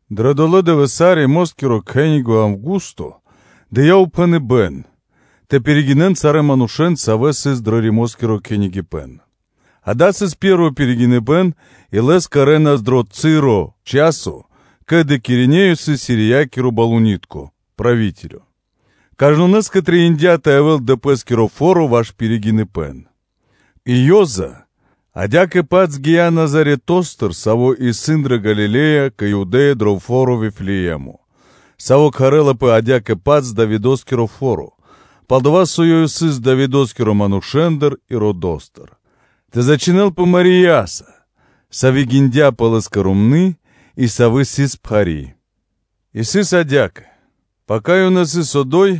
Дрэ долэ́ дывэса́ Римоскиро кхенинго (кесарё) Аўгусто дыя́ упхэныбэ́н тэ пиригинэн сарэ́ манушэ́н, савэ́ сыс пир сари́ пхув. Дава́ сыс пэ́рво пиригиныбэ́н и лэс кэрэ́нас дро дова́ часо, ке́ли о Квиринеё сыс Сириякирэ-тхэмэскиро барыдыро́. Кажнонэ́скэ трэиндя́ тэ явэ́л дро пэ́скиро фо́ро ваш пиригиныбэ́н. И Ёза (Иосифо) адя́кэ-паць гия́ Назаретостыр, саво́ исын дрэ Галиле́я кэ Юдэ́я дро фо́ро Вифлеэмо, саво́ кхарлапэ адя́кэ-паць “Давидо́скиро фо́ро”, пал-дова́ со ёв сыс Давидо́скирэ манушэ́ндыр и родо́стыр, тэ зачхинэлпэ Марияса, Сави́ гиндяпэ лэ́скэ сыр ромны́, и Сави́ сыс пхари́. И сыс адя́кэ: пака ёнэ сыс одо́й,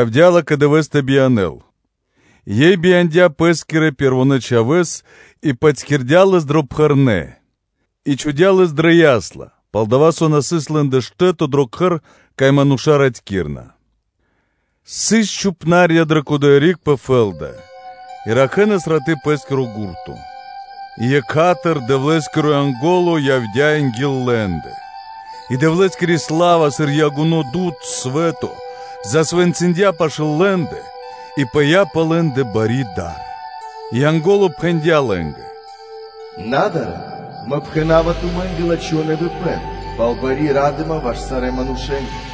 явдя́ Ла́кэ дывэ́с тэ биянэ́л, и Ёй бияндя́ Пэ́скирэ Пэрвонэ́ Чхавэ́с, и патькирдя Лэс дрэ пхэрнэ, и чхудя́ Лэс дрэ ясла (кхурлы), пал-дова́ со на сыс лэ́нгэ штэ́то дро затрадыпнытко кхэр (гостиница). Сыс чхупна́рья (пастухи) пэ кодоя риг пэ фэ́лда, и ракхэнас раты́ пэ́скиро гурто. И екха́тыр (сра́зу) Дэвлэ́скиро Янго́ло явдя́ анги́л лэ́ндэ, и Дэвлэ́скири сла́ва сыр ягуно дуд (свэ́то) засвэнцындя пашы́л лэ́ндэ; и пыя́ пэ лэ́ндэ бари дар. И Янго́ло пхэндя́ лэ́нгэ: “На дарэ́н, мэ пхэна́ва тумэ́нгэ лачхо́ нэвипэн пал бари ра́дыма ваш сарэ́ манушэ́нгэ.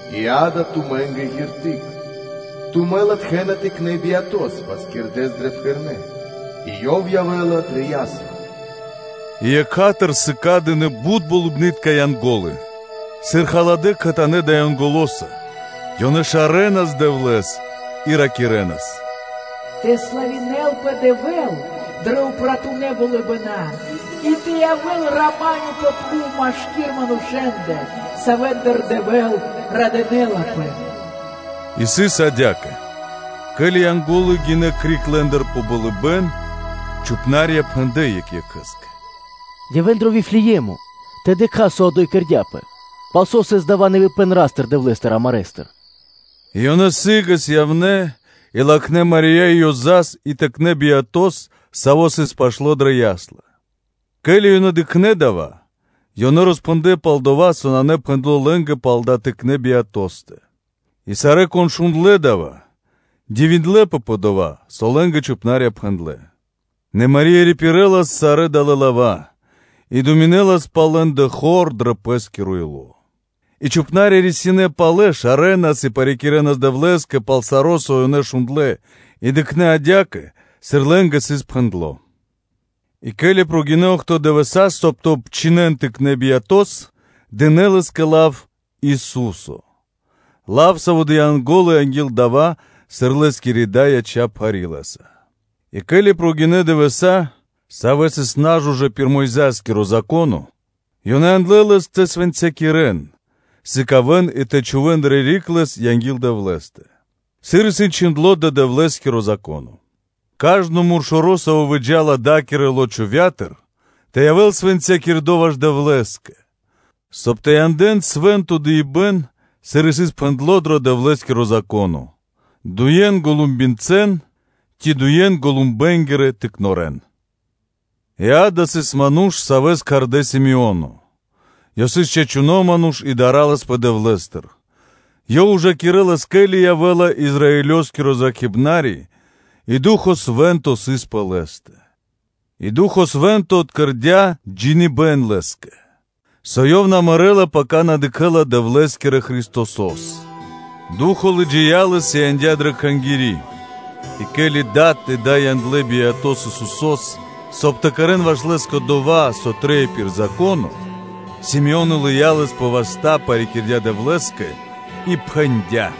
И, ґа́да, тумэ́нгэ знако (шпэ́ра): тумэ́ латхэ́на Тыкнэ́ Биятос патькирдэс дрэ пхэрнэ, и Ёв явэ́ла дрэ ясла.” И екха́тыр сыкадынэ бут болыбны́тка халадыбэна (Янго́лы) кхэтанэ́ далэ́ Янголоса; ёнэ шарэнас Дэвлэ́с и ракирэ́нас: “Тэ славинэлпэ Дэвэ́л дрэ упратунэ болыбэна, и тэ явэ́л рама́нё (миро) пэ пхув машки́р манушэ́ндэ, савэ́ндыр Дэвэ́л радынэ́лапэ.” И сыс адя́кэ: ке́ли Янго́лы гинэ́ криг лэ́ндыр пэ болыбэ́н, то чхупна́рья пхэндлэ́ екх екхэ́скэ: “Явэ́н дро Вифлее́мо тэ дыкхас, со одо́й кэрдя́пэ, пал со сыс дава́ нэвипэн Ра́стыр-Дэвлэ́стыр амарэстыр.” И ёнэ сы́гэс явнэ́, и латхнэ́ Мари́я и Ёзас (Иосифос) и Тыкнэ́ Биятос, Саво́ сыс пашто́ дрэ ясла (кхурлы). Ке́ли ёнэ дыкхнэ́ дава́, ёнэ роспхэндлэ́ пал дова́, со сыс пхэндло́ лэ́нгэ пал далэ́ Тыкнэ́ Биятостэ. И сарэ́, кон шундлэ́ дава́, дивиндлэ́пэ пэ дова́, со лэ́нгэ чхупна́рья пхэндлэ́. Нэ Мари́я рипирэлас сарэ́ далэ́ лава́, и думинэлас пал лэ́ндэ хор дро Пэ́скиро ило́. И чхупна́рья рисинэ́ палэ шарэнас и парикирэнас Дэвлэ́скэ пал саро́, со ёнэ шундлэ́ и дыкхнэ́ адя́кэ, сыр лэ́нгэ сыс пхэндло́. И ке́ли прогинэ́ охто́ (бидуе́нгиро дэш) дывэса́, соб (кай) тэ обчхинэн Тыкнэ́ Биятос, дынэ́ Лэ́скэ лав Ису́со, лав, саво́ дыя́ Янго́ло анги́л дава́, сыр Лэ́скири Дай яця́ пхари́ Лэ́са. И ке́ли прогинэ́ (накхлэ) дывэса́, савэ́ сыс на жужэ́ пир Мойза́скиро Зако́но, ёнэ яндлэ́ лэс тэ свэнцякирэн (тэ сыкавэ́н и тэ чхувэ́н дрэ риг Лэс) анги́л Дэвлэ́стэ, сыр исын чхиндло́ дро Дэвлэ́скиро Зако́но: “Кажно муршоро, саво́ выджа́ла да́кирэ лочовя́тыр (утробатыр), тэ явэ́л свэнцякирдо ваш Дэвлэ́скэ”, соб (кай) тэ янэ́н свэ́нто дыибэ́н (жэртва), сыр исын пхэндло́ дро Дэвлэ́скиро Зако́но, дуе́н голумбицэн ци дуе́н голумбэнгирэ тыкнорэн. И, ґа́да, сыс ману́ш, савэ́с кхардэ́ Симеоно; ёв сыс чачуно́ ману́ш и дарэлас Дэвлэ́стыр; ёв ужакирэлас, ке́ли явэ́ла Израилёскиро Зракхибнари, и Ду́хо (Фа́но) Свэ́нто сыс пэ лэ́стэ. И Ду́хо (Фа́но) Свэ́нто откэрдя джиныбэ́н Лэ́скэ, со ёв на мэрэ́ла, пака ёв дыкхэ́ла Дэвлэ́скирэ Христосо́с. Ду́хо (Фа́но) лыджия́ лэс и яндя́ дрэ Кхангири́. И ке́ли дад и дай яндлэ́ Биятос Исусо́с, соб (кай) тэ кэрэ́н ваш Лэ́скэ дова́, со трэй пир Зако́но, то Симеоно лыя́ Лэс пэ васта́, парикирдя Дэвлэ́скэ и пхэндя́: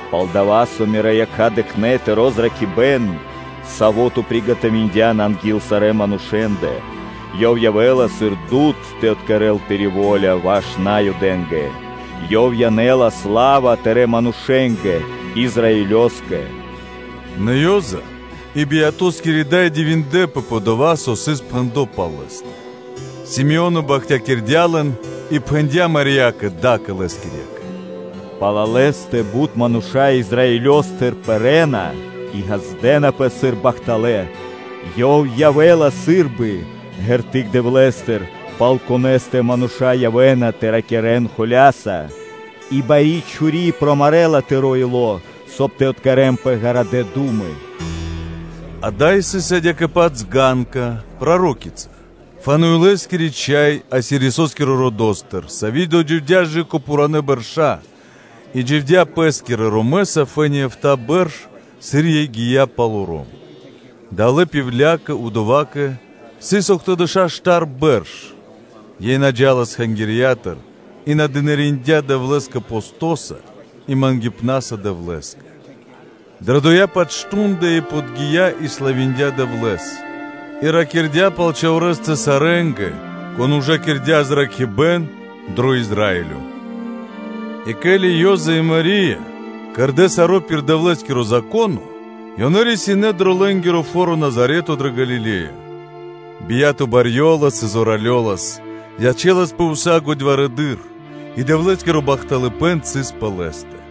Пал-дова́ со Мирэ́ якха́ дыкхнэ́ Тыро́ зракхибэ́н, Саво́ Ту приготовиндян анги́л сарэ́ манушэ́ндэ, Ёв явэ́ла сыр Дуд (Свэ́то) тэ откэрэл Тыри́ во́ля ваш Наюдэ́нгэ. Ёв янэ́ла сла́ва Тырэ́ манушэ́нгэ, Израилёскэ.” Нэ о Ёза, и Биятоскири Дай дивиндлэ́пэ пэ дова́, со сыс пхэндло́ пал Лэ́стэ. Симеоно бахтякирдя́ лэн и пхэндя́ Мариякэ, Дакэ Лэскирьякэ: “Пал Лэ́стэ бут мануша́ Израилёстыр пэрэ́на и ґаздэ́напэ сыр бахталэ́, Ёв явэ́ла сы́рбы ґерты́к (знако) Дэвлэ́стыр, пал Конэ́стэ мануша́ явэ́на тэ ракирэ́н холя́са; и курта́ла (мечо) промарэла тыро́ ило́, соб (кай) тэ откэрэнпэ ґарадэ́ ду́мы.” Ада́й сыс адя́кэ-паць Анна, пророчица, Фануилоскири чхай, Асироскирэ родо́стыр, сави́ додживдя кэ пхуранэ́ бэрша́ и дживдя́ пэ́скирэ ромэса фэ́ни эфта́ бэрш, сыр ёй гия́ палоро́м. Далэ́ пивлякэ (удовакэ) сыс охтодэша́ штар бэрш; ёй на джа́лас Кхангирья́тыр и дынариндя́ Дэвлэ́скэ постоса и мангипнаса Дэвлэ́скэ. Дрэ дова́-паць мардо́ (шту́нда) ёй подги́я и славиндя Дэвлэ́с, и ракирдя́ пал Чхаворэстэ сарэ́нгэ, кон ужакирдя выракхибэн дро Израилё. И ке́ли Ёза и Мари́я кэрдэ́ саро́ пир Дэвлэ́скиро Зако́но, ёнэ рисинэ́ дро лэ́нгиро фо́ро Назарето дрэ Галиле́я. Бия́то барьёлас и зоралёлас, ячэласпэ ўса годьварэдыр; и Дэвлэ́скиро бахтылэн сыс пэ Лэ́стэ.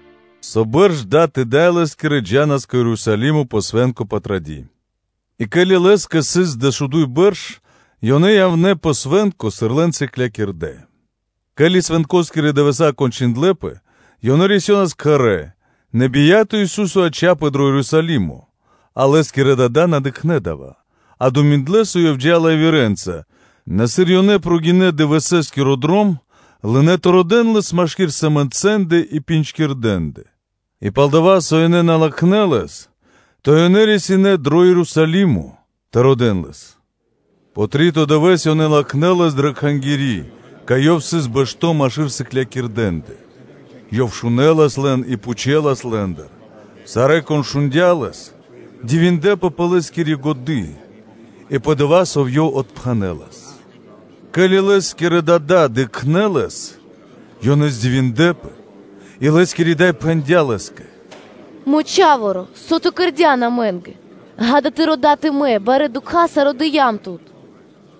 Со бэрш дад и дай Лэ́скирэ джа́нас кэ Ерусалимо пэ Свэ́нко Патради́. И ке́ли Лэ́скэ сыс дэшуду́й бэрш, ёнэ явнэ́ пэ свэ́нко, сыр лэн сыклякирдэ́. Ке́ли свэнкоскирэ дывэса́ кончындлэпэ, ёнэ рисёнас кхэрэ́, нэ Тэрнэ́-Бэршэнгиро Ису́со яця́пэ дро Ерусалимо, а Лэ́скирэ дада́ на дыкхнэ́ дава́; а ёнэ думиндлэ, со Ёв джа́ла явирэнца, нэ сыр ёнэ прогинэ́ (накхлэ) дывэсэскиро дром, лынэ́ тэ родэ́н Лэс машки́р сэмэнцэндэ и джиндлэндэ (пинджкирдэндэ), и пал-дова́ со ёнэ на латхнэ́ Лэс, то ёнэ рисинэ́ дро Ерусалимо тэ родэ́л Лэс. Пэ три́то дывэ́с ёнэ латхнэ́ Лэс дрэ Кхангири́, кай Ёв сыс бэшто́ машки́р сыклякирдэндэ: Ёв шунэлас лэн и пхучэлас Лэ́ндыр. Сарэ́, кон шундя́ Лэс, дивиндлэ́пэ пэ Лэ́скири годы́ и пэ дова́, сыр Ёв отпхэнэ́лас. Ке́ли Лэ́скирэ дада́ дыкхнэ́ Лэс, ёнэ здивиндлэпэ, и Лэ́скири Дай пхэндя́ Лэ́скэ: “Мро Чха́воро! Со Ту кэрдя́н амэ́нгэ? Ѓа́да, Тыро́ дад и Мэ барэ́ дукхаса родыям Тут.”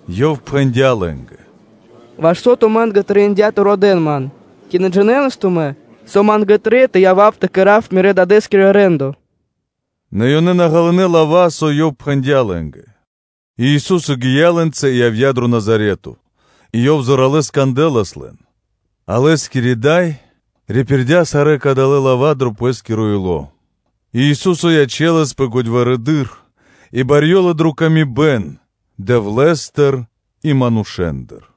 Ёв пхэндя́ лэ́нгэ: “Ваш со тумэ́нгэ трэиндя́ тэ родэ́н Ман? Ци на джинэнас тумэ́, со Ма́нгэ трэй тэ явав тэ кэра́в Мирэ́-Дадэ́скиро рэ́ндо.” Нэ ёнэ на ґалынэ́ лава́, со Ёв пхэндя́ лэ́нгэ. И Ису́со гия́ лэ́нца и явдя́ дро Назарето, и Ёв зоралэ́с кандэлас лэн. А Лэ́скири Дай рипирдя сарэ́ кадалэ́ лава́ дро Пэ́скиро ило́. И Ису́со ячэласпэ годьварэдыр и барьёлас дро ла́ска Дэвлэ́стыр и манушэ́ндыр.